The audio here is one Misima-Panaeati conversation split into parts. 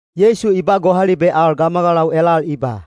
Yeisu i ba gohalibe al gamagalau elal i ba,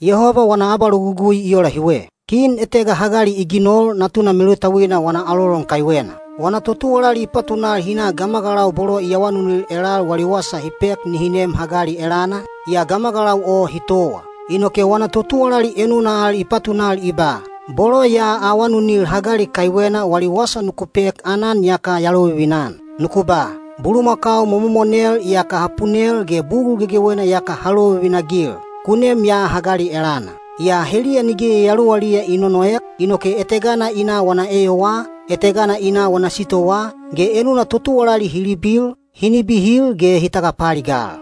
“Yehoba wana abalogugui i ola hiwe. Kin etega hagali i ginol natuna melutauina wana alolon kaiwena. Wana totuwalali i patunal hi na gamagalau bolo i awanunil elal wali wasa hi pek nihi nem hagali elana, yaa gamagalau o hi towa. “Inoke wana totuwalali enuna al i patunal i ba, ‘Bolo ya awanunil hagali kaiwena wali wasa nuku pek aanan iyaka ya lovivina-an. Nuku ba: Bulumakau momomonel iyaka ha punel ge bugul gegewena iyaka ha lovivina-agil. Ku nem ya hagali elana.’ “Yaa heliya nige yayaluwaliya i nonoek, inoke etegana i na wana eyowaa, etegana i na wana sitowaa, ge enuna totuwalali hi libil, hi nibihil ge hi tagapaaligal.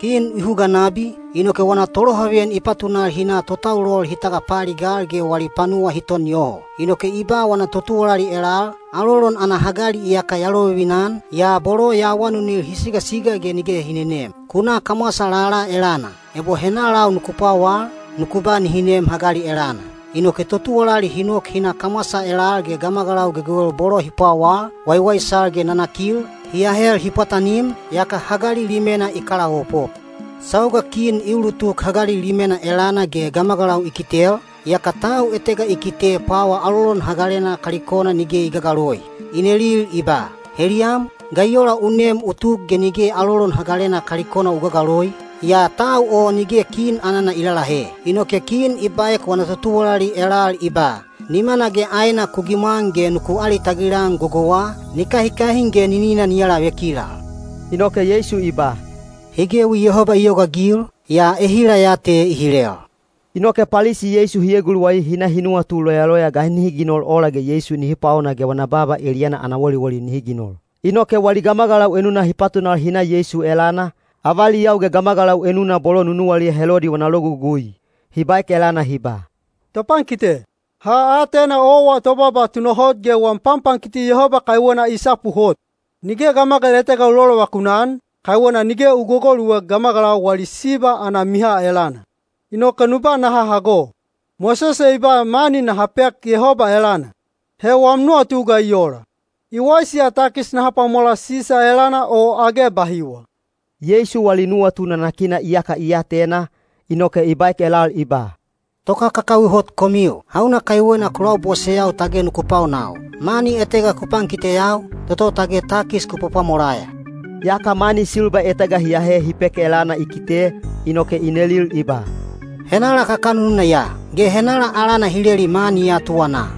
Kin i huga nabi, inoke wana tolohaveyan i patunal hi na totaulol hi tagapaaligal ge wali panuwa hi ton yoho. “Inoke i ba wana totuwalali elal, ‘Alolon ana hagali iyaka ya lovivina-an, yaa bolo ya awanunil hi sigasiga ge nige hi nenem. Ku na kamwasa lala elana. Ebo henalau nuku pwawal, nuku ba nihi nem hagali elana.’ Inoke totuwalali hi nok hi na kamwasa elal ge gamagalau gegewel bolo hi pwawal, waiwaisal ge nanakil, hi ahel hi pwatanim, yaka hagali limena i kalaopop. “Sauga kin i ulutuk hagali limena elana ge gamagalau i kitel, yaka tau etega i kite pwawa alolon hagalena kalikona nige i gagaloi. I neli i ba, ‘Heliyam, ga i ola u nem u tuk ge nige alolon hagalena kalikona u gagaloi?’ Yaa tau o nige kin anana i lalahe. Inoke kin i baek wana totuwalali elal i ba, ‘Nimana ge aena ku gimwan ge nuku alitagil-an gogouwa, ni kahikahin ge ninina ni alavekilal.’” Inoke Yeisu i ba, “Hi gewi Yehoba i yogaagil, yaa ehila ya te i hilel.” Inoke Palisi Yeisu hi eguluwai hi na hi nuwatu loyaloya ga nihi ginol ola ge Yeisu nihi paona ge wana baaba eliyana ana woliwoli nihi ginol. Inoke wali gamagalau enuna hi patunal hi na Yeisu elana, avaliyau ge gamagalau enuna bolo nunuwaliya Helodi wana logugui. Hi baek elana hi ba, “Topankite, ha atena owa tobaaba tunahot ge wam panpankiti Yehoba kaiwena i sapu hot. Nige gamagal etega u lolovakun-an, kaiwena nige u gogoluek gamagalau wali siba ana miha elana. Inoke nu ba naha hago. Mosese i ba mani naha pek Yehoba elana. He wam nuwatu ga i ola? I waisi ya takis naha pwamola Sisa elana o age bahiwa?” Yeisu wali nuwatu nanakina iyaka i atena, inoke i baek elal i ba, “Tokakakawi hot komiu! Hauna kaiwena ku laboseyau tage nuku paonau? Mani etega ku pankiteyau, toto tage takis ku pwapwamolaya.” Yaka mani silba etega hi ahe hi pek elana i kite, inoke i nelil i ba, “Henala kakanununa ya? Ge henala alana hi leli mani ya tuwanaa?”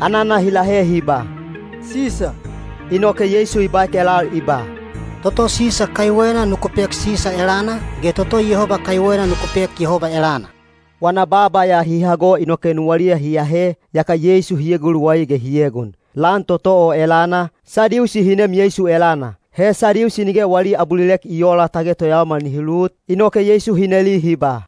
Anana hi lahe hi ba, “Sisa.” Inoke Yeisu i baek elal i ba, “Toto Sisa kaiwena nuku pek Sisa elana, ge toto Yehoba kaiwena nuku pek Yehoba elana.” Wana baaba ya hi hago inoke nuwaliya hi ahe, yaka Yeisu hi eguluwai ge hi egon. Lan toto o elana, Sadiusi hi nem Yeisu elana. He Sadiusi nige wali abulilek i oola tage toyaomal nihi lut, inoke Yeisu hi neli hi ba,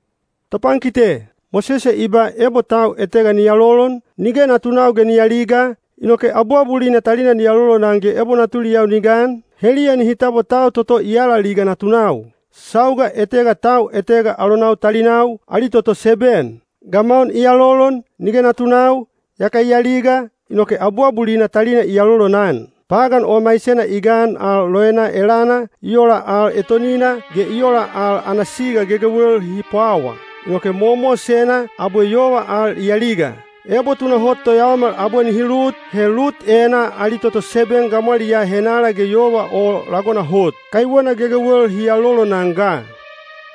“Topankite, Mosese i ba ebo tau etega ni alolon, nige natunau ge ni aliga, inoke abuabulina talina ni alolonan ge ebo natuliyau ni gan, heliya nihi tabwa tau toto i alaliga natunau. Sauga etega tau etega alonau talinau, ali toto seben. Gamaun i alolon, nige natunau, yaka i aliga, inoke abuabulina talina i alolonan. Pagan o maisena i gan al loena elana, i ola al etonina, ge i ola al ana siga gegewel hi pwawa. Inoke mowamowasena, abwe yova al i aliga. Ebo tunahot toyaomal abwe nihi lut, he lut enaa ali toto seben gamwaliyaa henala ge yova o lagona hot? Kaiwena gegewel hi alolonan ga.”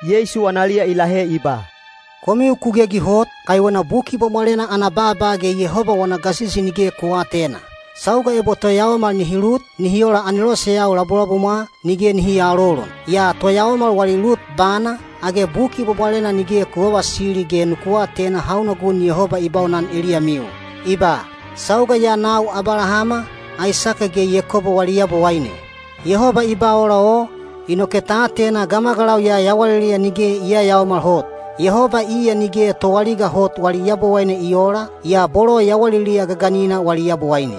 Yeisu analiya i lahe i ba, “Komiu ku gegi hot, kaiwena Buki Bwabwalena ana baaba ge Yehoba wana gasisi nige ku aatena. Sauga ebo toyaomal nihi lut, nihi ola aneloseyau labulabumwa, nige nihi aalolon. Yaa toyaomal wali lut bana, age Buki Bwabwalena nige ku vavasili ge nuku atena hauna gun Yehoba i baunan eliyamiu? I ba, ‘Sauga ya nau Abalahama, Aisake ge Yakobo wali Yabowaine.’ Yehoba i ba ola o, inoke ta atena gamagalau ya yawaliliya nige i yayaomal hot. Yehoba iya nige toaliga hot wali Yabowaine i oola, yaa bolo yawaliliya gaganina wali Yabowaine.”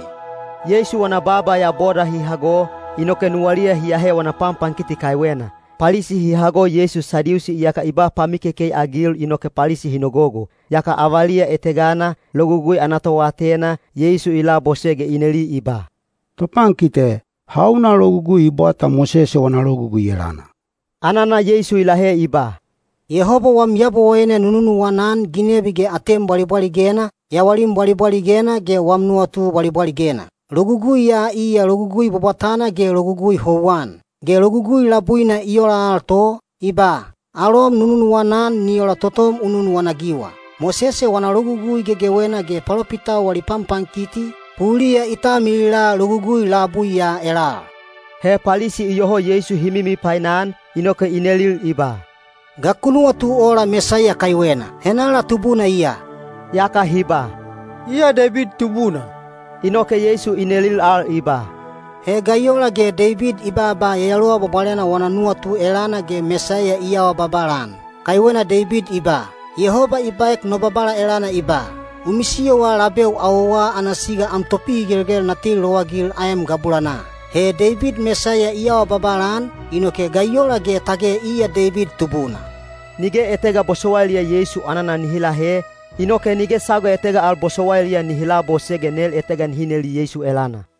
Yeisu wana baaba ya boda hi hago, inoke nuwaliya hi ahe wana panpankiti kaiwena. Palisi hi hago Yeisu Sadiusi iyaka i ba pamikekei-agil inoke Palisi hi nogogo. Yaka avaliya etegana, Logugui ana toatena, Yeisu i labose ge i neli i ba, “Topankite, hauna logugui i bwata Mosese wana Logugui elana?” Anana Yeisu i lahe i ba, “‘Yehoba wam Yabowaine nu nunuwana-an ginebi ge atem bwalibwaligena, yawalim bwalibwaligena ge wam nuwatu bwalibwaligena.’ Logugui ya iya logugui bwabwatana ge logugui houwan. Ge logugui labuina i ola al to, i ba, ‘Alom nu nunuwana-an ni ola totom u nunuwana-agiwa.’ Mosese wana Logugui gegewena ge palopitau wali panpankiti, puliya i talmilila logugui labui ya elal.” He Palisi iyoho Yeisu hi mimipainan, inoke i nelil i ba, “Ga ku nuwatu ola Mesaiya kaiwena? Henala tubuna iya?” Yaka hi ba, “Iya Deibid tubuna.” Inoke Yeisu i nelil al i ba, “He ga i ola ge Deibid i baaba Yayaluwa Bwabwalena wana nuwatu elana ge Mesaiya i awa babala-an? Kaiwena Deibid i ba, ‘Yehoba i baek no Babala elana i ba: U misiyowa labeu awowa ana siga am topihigelgel na teli lowagil aem gabulanaa.’ He Deibid Mesaiya i awa babala-an, inoke ga i ola ge tage iya Deibid tubuna?” Nige etega bosowailiya Yeisu anana nihi lahe, inoke nige sauga etega al bosowailiya nihi labose ge nel etega nihi neli Yeisu elana.